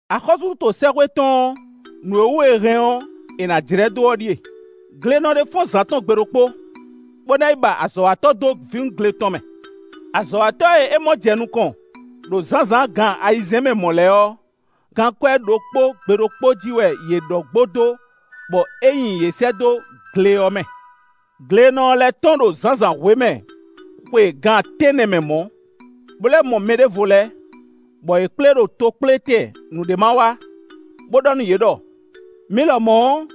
“Axɔ́súɖuto sɛ́xwé tɔn ɔ́, nǔ e wú è hɛn ɔ́, è nǎ jlɛ́ dó ɔ́ ɖíe: glenɔ ɖé fɔ́n zǎn tɔ́n gbe ɖokpó, bó ná yi ba azɔ̌watɔ́ dó vǐwungle tɔn mɛ. Azɔ̌watɔ́ e é mɔ jɛ nukɔn, ɖo zǎnzǎn gan ayizɛ́n mɛ mɔ̌ lɛ́ɛ ɔ́, gankwɛ́ ɖokpó, gbe ɖokpó jí wɛ yě ɖɔ gbo dó; bɔ é nyi yě sɛ́ dó gle ɔ́ mɛ. Glenɔ ɔ́ lɛ́ tɔ́n ɖo zǎnzǎnhwe mɛ xwe gan tɛ́nnɛ mɛ mɔ̌, bó lɛ́ mɔ mɛ ɖěvo lɛ́ɛ, bɔ yě kplé ɖo tokplétɛn nǔɖé ma wa, bó ɖɔ nú yě ɖɔ: ‘Mi lɔmɔ̌ ɔ́,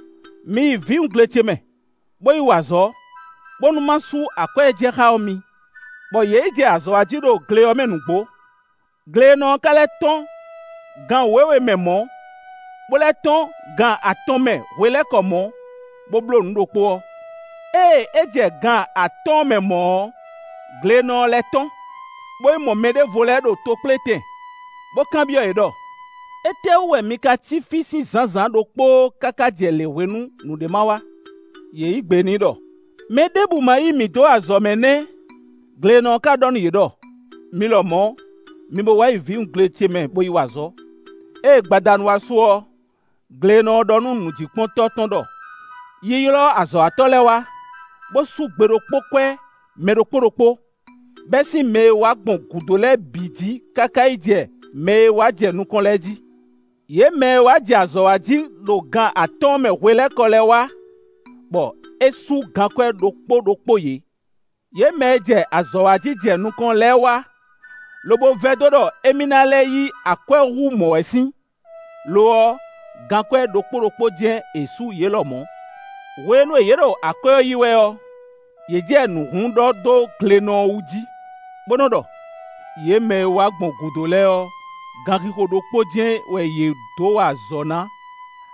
mi yi vǐwungle ce mɛ, bó yi wa azɔ̌, bónú ma sú akwɛ́ e jɛ xá ɔ́ mi,’ bɔ yě yi jɛ azɔ̌ wa jí ɖo gle ɔ́ mɛ nǔgbó. Glenɔ ɔ́ ka lɛ́ tɔ́n gan wěwe mɛ mɔ̌, bó lɛ́ tɔ́n gan atɔn mɛ hwelɛ́kɔ mɔ̌, bó bló nǔ ɖokpó ɔ́. Ée é jɛ gan atɔ́ɔ́n mɛ mɔ̌ ɔ́, glenɔ ɔ́ lɛ́ tɔ́n, bó yi mɔ mɛ ɖěvo lɛ́ɛ ɖo tokplétɛn, bó kanbyɔ́ yě ɖɔ: ‘Étɛ́wú wɛ mi ka cí fí sín zǎnzǎn ɖokpóó káká jɛ lěhwenu nǔɖé ma wa?’ Yě yí gbe n'i ɖɔ: ‘Mɛ ɖěbǔ ma yí mǐ dó azɔ̌mɛ nɛ́!’ Glenɔ ɔ́ ka ɖɔ nú yě ɖɔ: ‘Mi lɔmɔ̌, mi bo wá yi vǐwungle ce mɛ bó yi wa azɔ̌.’ “Ée gbadanu wá su ɔ́, glenɔ ɔ́ ɖɔ nú nǔjíkpɔ́ntɔ́ tɔn ɖɔ: ‘Yi ylɔ́ azɔ̌watɔ́ lɛ́ɛ wá, bó sú gbeɖokpókwɛ́ mɛ ɖokpó ɖokpó, bɛ́ sín mɛ e wá gbɔn gǔdo bǐ lɛ́ɛ jí káká yi jɛ mɛ e wá jɛ nukɔn lɛ́ɛ jí.’ Yě mɛ e wá jɛ azɔ̌ wa jí ɖo gan atɔ́ɔ́n mɛ hwelɛ́kɔ lɛ́ɛ wá, bɔ é sú gankwɛ́ ɖokpó ɖokpó yě. Yě mɛ e jɛ azɔ̌ wa jí jɛ nukɔn lɛ́ɛ wá, lobo vɛdó ɖɔ émí lɛ́ɛ ná yí akwɛ́ hú mɔ̌ wɛ sín; lo ɔ́, gankwɛ́ ɖokpó ɖokpó jɛ́n è sú yě lɔmɔ̌. Hwenu e yě ɖo akwɛ́ ɔ́ yí wɛ ɔ́, yě jɛ nǔ hlún ɖɔ dó glenɔ ɔ́ wú jí, bó nɔ́ ɖɔ: ‘Yě mɛ e wá gbɔn gǔdo lɛ́ɛ ɔ́, gan xixo ɖokpó jɛ́n wɛ yě dó wa azɔ̌ ná.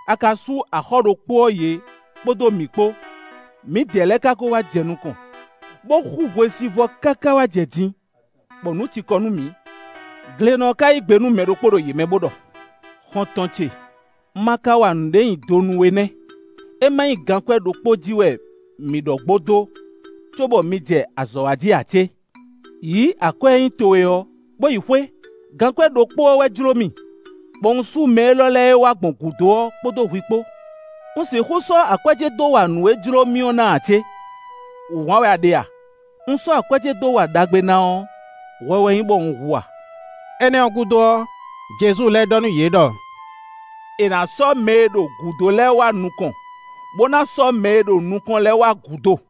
A ka sú axɔ́ ɖokpó ɔ́ yě kpódó mǐ kpó; mǐdɛɛ lɛ́ɛ ka ko wá jɛ nukɔn, bó xú hwesivɔ́ káká wá jɛ din, bɔ nǔ cikɔ nú mǐ.’ Glenɔ ɔ́ ka yí gbe nú mɛ ɖokpó ɖo yě mɛ, bó ɖɔ: ‘Xɔ́ntɔn ce; un ma ka wa nǔɖé nyi do nú we nɛ́; é má nyí gankwɛ́ ɖokpó jí wɛ mǐ ɖɔ gbo dó, cóbɔ mi jɛ azɔ̌ wa jí ǎ cé? Yǐ akwɛ́ e nyí towe ɔ́, bó yi xwé; gankwɛ́ ɖokpó ɔ́ wɛ jló mì, bɔ un sú mɛ élɔ́ e wá gbɔn gǔdo ɔ́ kpódó hwi kpó. Un sixú sɔ́ akwɛ́ ce dó wa nǔ e jló mì ɔ́ ná ǎ cé? Wǔhwan wɛ a ɖe a? Un sɔ́ akwɛ́ ce dó wa ɖagbe ná ɔ́, hwɛ wɛ nyí bɔ un hu a?’” Énɛ́ ɔ́ gúdo ɔ́, Jezu lɛ́ ɖɔ nú yě ɖɔ: “È nǎ sɔ́ mɛ e ɖo gǔdo lɛ́ɛ wá nukɔn; bó ná sɔ́ mɛ e ɖo nukɔn lɛ́ɛ wá gǔdo.”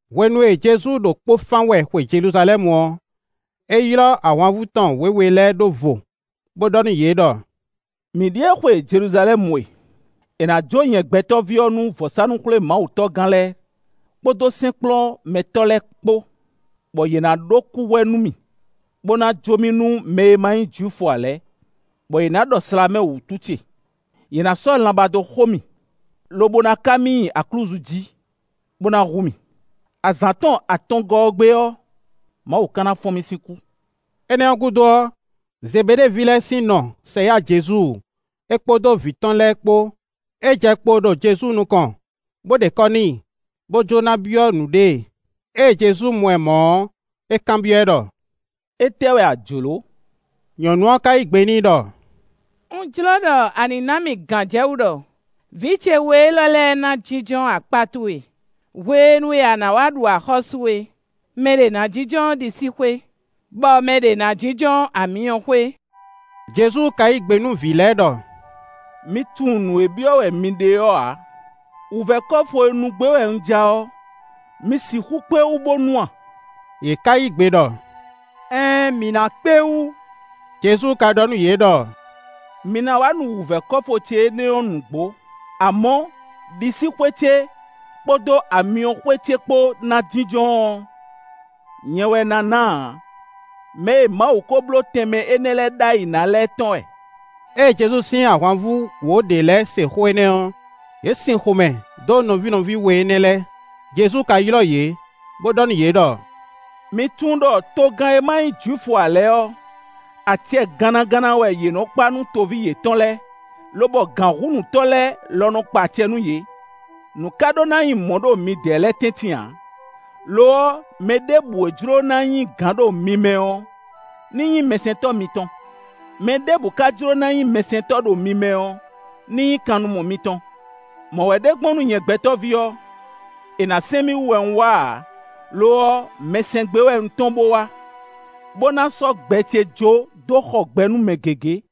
Hwenu e Jezu ɖo kpó fán wɛ xwe Jeluzalɛ́mu ɔ́, é ylɔ́ ahwanvú tɔn wěwe lɛ́ɛ ɖó vo, bó ɖɔ nú yě ɖɔ: “Mǐ ɖíe xwe Jeluzalɛ́mu e; è nǎ jó nyɛ Gbɛtɔ́ví ɔ́ nú vɔ̌sánú-xwlémawutɔ́gán lɛ́ɛ kpódó sɛ́nkplɔ́nmɛtɔ́ lɛ́ɛ kpó, bɔ yě ná ɖó kúhwɛ nú mì, bó ná jó mì nú mɛ e ma nyí Jwifu ǎ lɛ́ɛ, bɔ yě ná ɖɔ slǎmɛ wǔtu ce; yě ná sɔ́ lanbá dó xo mì, lobo ná ká mì nyi aklúzu jí, bó ná hu mì. Azǎn tɔn atɔngɔ́ ɔ́ gbe ɔ́, Mawu ka ná fɔ́n mì sín kú.” Énɛ́ ɔ́ gúdo ɔ́, Zebeɖée ví lɛ́ɛ sín nɔ sɛ yá Jezu é kpódó vǐ tɔn lɛ́ɛ kpó; é jɛ kpo ɖo Jezu nukɔn, bó ɖe kɔ́ n'i, bó jló ná byɔ́ nǔɖé e. Ée Jezu mɔ ɛ mɔ̌ ɔ́, é kanbyɔ́ ɛ ɖɔ: “Étɛ́ wɛ a jlǒ?” Nyɔ̌nu ɔ́ ka yí gbe n'i ɖɔ: “Un jló ɖɔ a nǐ ná mì gǎnjɛwú ɖɔ vǐ ce we élɔ́ lɛ́ɛ ná jínjɔ́n akpá towe hwenu e a nǎ wá ɖu axɔ́sú é. Mɛɖě ná jínjɔ́n ɖisíxwé, bɔ mɛ ɖě ná jínjɔ́n amyɔxwé.” Jezu ka yí gbe nú vǐ lɛ́ɛ ɖɔ: “Mi tunwun nǔ e byɔ́ wɛ mi ɖe ɔ́ ǎ. Wǔvɛ́ kɔ́fu e nu gbé wɛ un ja ɔ́, mi sixú kpé wú bó nu a?” Yě ká yí gbe ɖɔ: “Ɛɛn mǐ ná kpé wú.” Jezu ka ɖɔ nú yě ɖɔ: “Mi ná wá nu wǔvɛ́ kɔ́fu ce énɛ́ ɔ́ nǔgbó; amɔ̌, ɖisíxwé ce kpódó amyɔxwé ce kpó ná jínjɔ́n ɔ́, nyɛ wɛ ná ná ǎ; mɛ e Mawu ko bló tɛnmɛ énɛ́ lɛ́ɛ ɖ'ayǐ ná lɛ́ɛ tɔn wɛ.” Ée Jezu sín ahwanvú wǒ ɖě lɛ́ɛ se xó énɛ́ ɔ́, yě sin xomɛ dó nɔví nɔví we énɛ́ lɛ́ɛ. Jezu ka ylɔ́ yě, bó ɖɔ nú yě ɖɔ: “Mi tunwun ɖɔ togán e ma nyí Jwifu ǎ lɛ́ɛ ɔ́, acɛ gannaganna wɛ yě nɔ́ kpa nú toví yětɔn lɛ́ɛ lobɔ gǎnhúnǔtɔ́ lɛ́ɛ lɔ nɔ kpa acɛ nú yě. Nǔ ka ɖó ná nyí mɔ̌ ɖo midɛɛ lɛ́ɛ tɛ́ntin ǎ; lo ɔ́, mɛ ɖěbǔ e jló ná nyí gǎn ɖo mi mɛ ɔ́, ní nyí mɛsɛntɔ́ mitɔn. Mɛ ɖěbǔ ka jló ná nyí nukɔntɔ́ ɖo mi mɛ ɔ́, ní nyí kannumɔ mitɔn. Mɔ̌ wɛ ɖe gbɔn nú nyɛ Gbɛtɔ́ví ɔ́; è nǎ sɛn mì wú wɛ un wá ǎ; lo ɔ́, mɛ sɛn gbé wɛ un tɔ́n bó wá, bó ná sɔ́ gbɛ ce jó dó xɔ gbɛ nú mɛ gěgé.”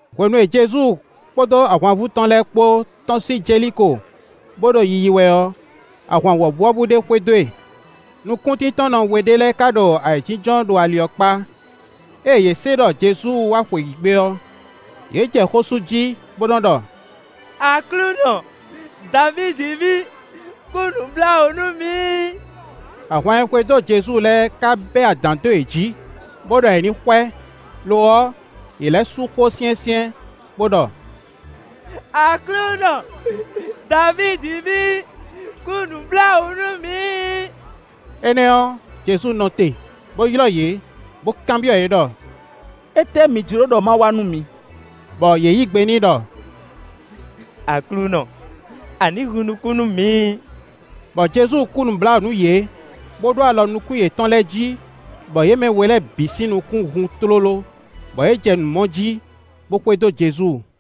Hwenu e Jezu kpódó ahwanvú tɔn lɛ́ɛ kpó tɔ́n sín Jeliko, bó ɖo yiyi wɛ ɔ́, ahwan wɔ̌buwɔ́bú ɖé xwedó e. Nukúntíntɔ́nnɔ we ɖé lɛ́ɛ ka ɖo ayǐjínjɔ́n ɖo ali ɔ́ kpá. Ée yě se ɖɔ Jezu wá xweyǐgbe ɔ́, yě jɛ xó sú jí, bó nɔ́ ɖɔ: “Aklúnɔ! Davídi ví, kú nǔbláwǔ nú mǐ.” Ahwan e xwedó Jezu lɛ́ɛ ka bɛ́ adǎn dó yě jí, bó ɖɔ yě ní xwɛ. Lo ɔ́, yě lɛ́ sú xó syɛ́nsyɛ́n, bó ɖɔ: “Aklúnɔ! Davídi ví, kú nǔbláwǔ nú mǐ.” Énɛ́ ɔ́, Jezu nɔ te, bó ylɔ́ yě, bó kanbyɔ́ yě ɖɔ: “Étɛ́ mi jló ɖɔ má wa nú mi?” Bɔ yě yí gbe n'i ɖɔ: “Aklúnɔ, a ní hun nukún nú mǐ.” Bɔ Jezu kú nǔbláwǔ nú yě, bó ɖó alɔ nukún yětɔn lɛ́ɛ jí, bɔ yě mɛ we lɛ́ɛ bǐ sín nukún hun tlóló, bɔ yě jɛ nǔ mɔ jí, bó xwedó Jezu.